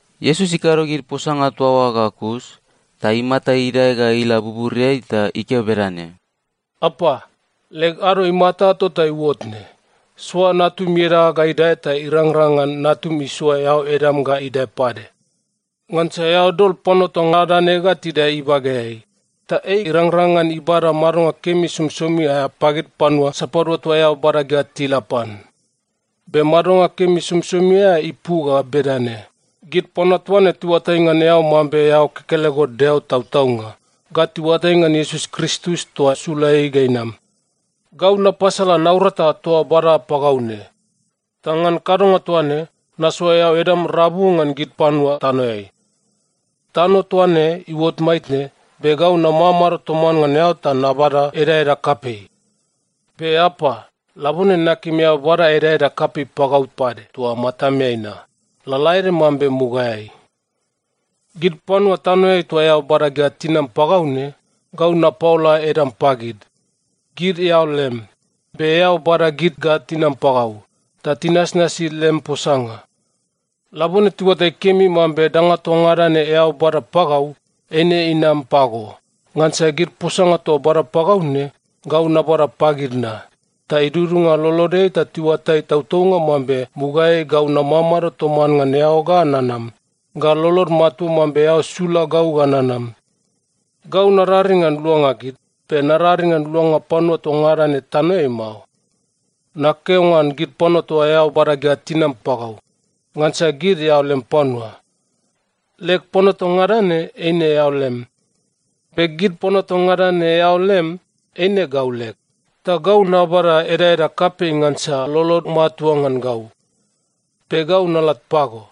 Iesus ikado gid posanga toa oa ga kus, ta imata idae ga ila buburiai ta ikeo bedane, “Apa, leg ado imata tota iuot ne. Soa Natum ieda ga idae ta irangrang ngan Natum isoa eao edam ga idae pade. Ngansa eao dol panua toa ngada ne ga tidae ibageai, ta ei irangrang ngan ibada madonga kemi somisomi aea pagid panua sapadua toa eao bada ga tila pan. Be madonga kemi somisomi aea ipu ga bedane: Gid panua toa ne tiuatai ngan eao mambe eao kekelego Deo tautaunga, ga tiuatai ngan Iesus Kristus toa sula ei ga inam. Gau napasala naurata toa bada pagau ne. Ta ngan kadonga toa ne, nasoa eao edam rabu ngan gid panua tanoeai. Tano toa ne iuot maitne, be gau namamado toman ngan eao ta nabada edaeda kapei. Be Apa, labone nakim eao bada edaeda kapei pagau pade toa matameai na, lalaede mambe mugaeai. “Gid panua tanoeai toa eao bada ga tinam pagau ne, gau napaola edam pagid. Gid eao lem. Be eao bada gid ga tinam pagau, ta tinasnasi lem posanga. Labone tiuatai kemi mambe danga toa ngada ne eao bada pagau, eine inam pago. Ngansa gid posanga toa bada pagau ne, gau nabada pagid na, ta idudunga lolodeai ta tiuatai tautaunga mambe mugaeai gau namamado toman ngan eao ga nanam, ga lolod matua mambe eao sula gau ga nanam. Gau nararing ngan luanga gid, be nararing ngan luanga panua toa ngada ne tanoeai mao. Nakeo ngan gid panua toa eao bada ga tinam pagau, ngansa gid eao lem panua. Leg panua toa ngada ne, eine eao lem. Be gid panua toa ngada ne eao lem, eine gau leg. Ta gau nabada edaeda kapei ngansa lolod matua ngan gau. Be gau nalat pago,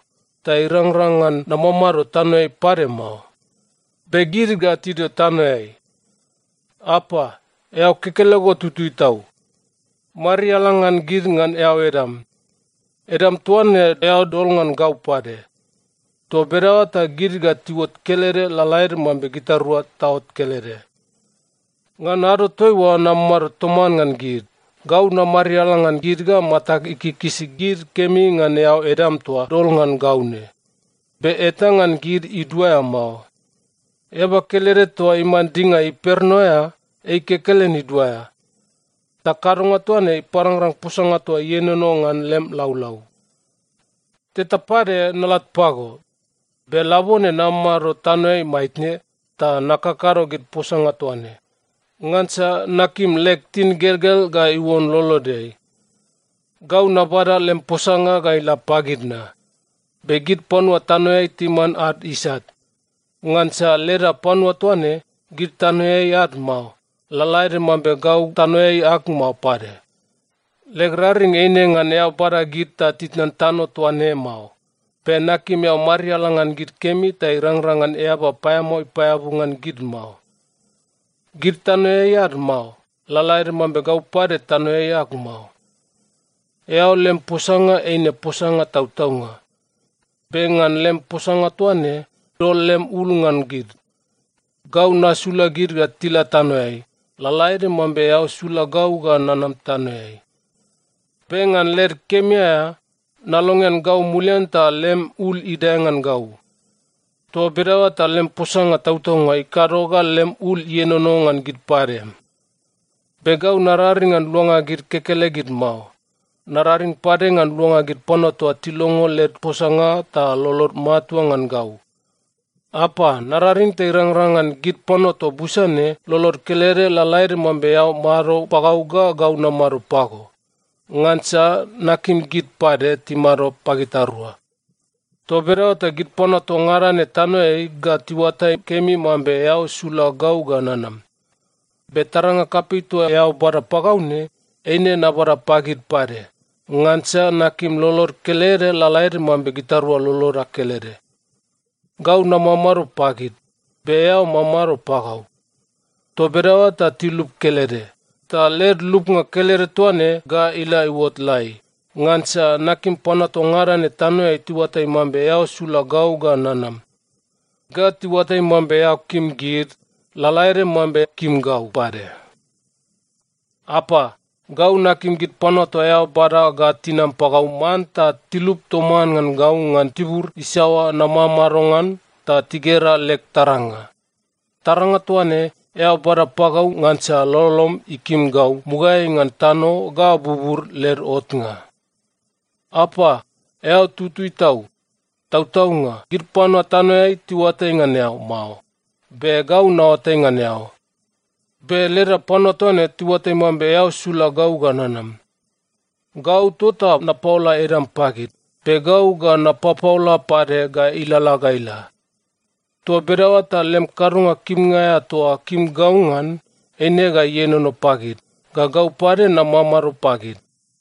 ta irangrang ngan namamado tanoeai pade mao. Be gid ga tidio tanoeai. Apa, eao kekelego tutui tau. Mariala ngan gid ngan eao edam. Edam toa ne eao dol ngan gau pade. Toa bedaoa ta gid ga tiuot kelede lalaede mambe gitarua taot kelede. Ngan ado toaiua namamado toman ngan gid, gau namariala ngan gid ga matag ikikisi gid kemi ngan eao edam toa dol ngan gau ne. Be eta ngan gid iduaea mao. Eaba kelede toa iman dinga imperno aea, ei kekelen iduaea. Ta kadonga toa ne iparangrang posanga toa ienono ngan lem laulau. “Teta pade nalat pago, be labone namamado tanoeai maitne ta nakakado gid posanga toa ne. Ngansa nakim leg tingelgel ga iuon lolodeai. Gau nabada lem posanga ga ila pagid na. Be gid panua tanoeai timan ad isat, ngansa leda panua toa ne, gid tanoeai ad mao, lalaede mambe gau tanoeai ag mao pade. Leg raring eine ngan eao bada gid ta titnan tano toa ne mao. Be nakim eao mariala ngan gid kemi ta irangrang ngan eaba paeamao ipaeabu ngan gid mao. Gid tanoeai ad mao, lalaede mambe gau pade tanoeai ag mao. Eao lem posanga eine posanga tautaunga. Be ngan lem posanga toa ne, dol lem ul ngan gid. Gau nasula gid ga tila tanoeai, lalaede mambe eao sula gau ga nanam tanoeai. Be ngan led kemi aea, nalongean gau mulian ta lem ul idae ngan gau. Toa bedaoa ta lem posanga tautaunga ikado ga lem ul ienono ngan gid pade. “Be gau nararing ngan luanga gid kekelegid mao. Nararing pade ngan luanga gid panua toa tilongo led posanga ta lolod matua ngan gau. Apa, nararing ta irangrang ngan gid panua toa busa ne lolod kelede, lalaede mambe eao mado pagau ga gau namado pago. Ngansa nakim gid pade timado pagitarua. Toa bedaoa ta gid panua toa ngada ne tanoeai ga tiuatai kemi mambe eao sula gau ga nanam. Be taranga kapei toa eao bada pagau ne, eine nabada pagid pade. Ngansa nakim lolod kelede, lalaede mambe gitarua loloda kelede. Gau namamado pagid, be eao mamado pagau. Toa bedaoa ta tilup kelede, ta led lupnga kelede toa ne ga ila iuot lai. Ngansa nakim panua toa ngada ne tanoeai tiuatai mambe eao sula gau ga nanam, ga tiuatai mambe eao kim gid lalaede mambe kim gau pade. “Apa, gau nakim gid panua toa eao bada ga tinam pagau manta tilup toman ngan gau ngan tibur isaoa namamado ngan ta tigera leg taranga. Taranga toa ne, eao bada pagau ngansa lolom ikim gau mugaeai ngan tano ga bubur led otnga. “Apa, eao tutui tau. Tautaunga, gid panua tanoeai tiuatai ngan eao mao. Be gau naoatai ngan eao. Be leda panua toa ne tiuatai mambe eao sula gau ga nanam. Gau tota napaola edam pagid, be gau ga napapaola pade ga ilalala ga ila. Toa bedaoa ta lem kadonga kimnga aea toa kim gau ngan, eine ga ienono pagid, ga gau pade namamado pagid.”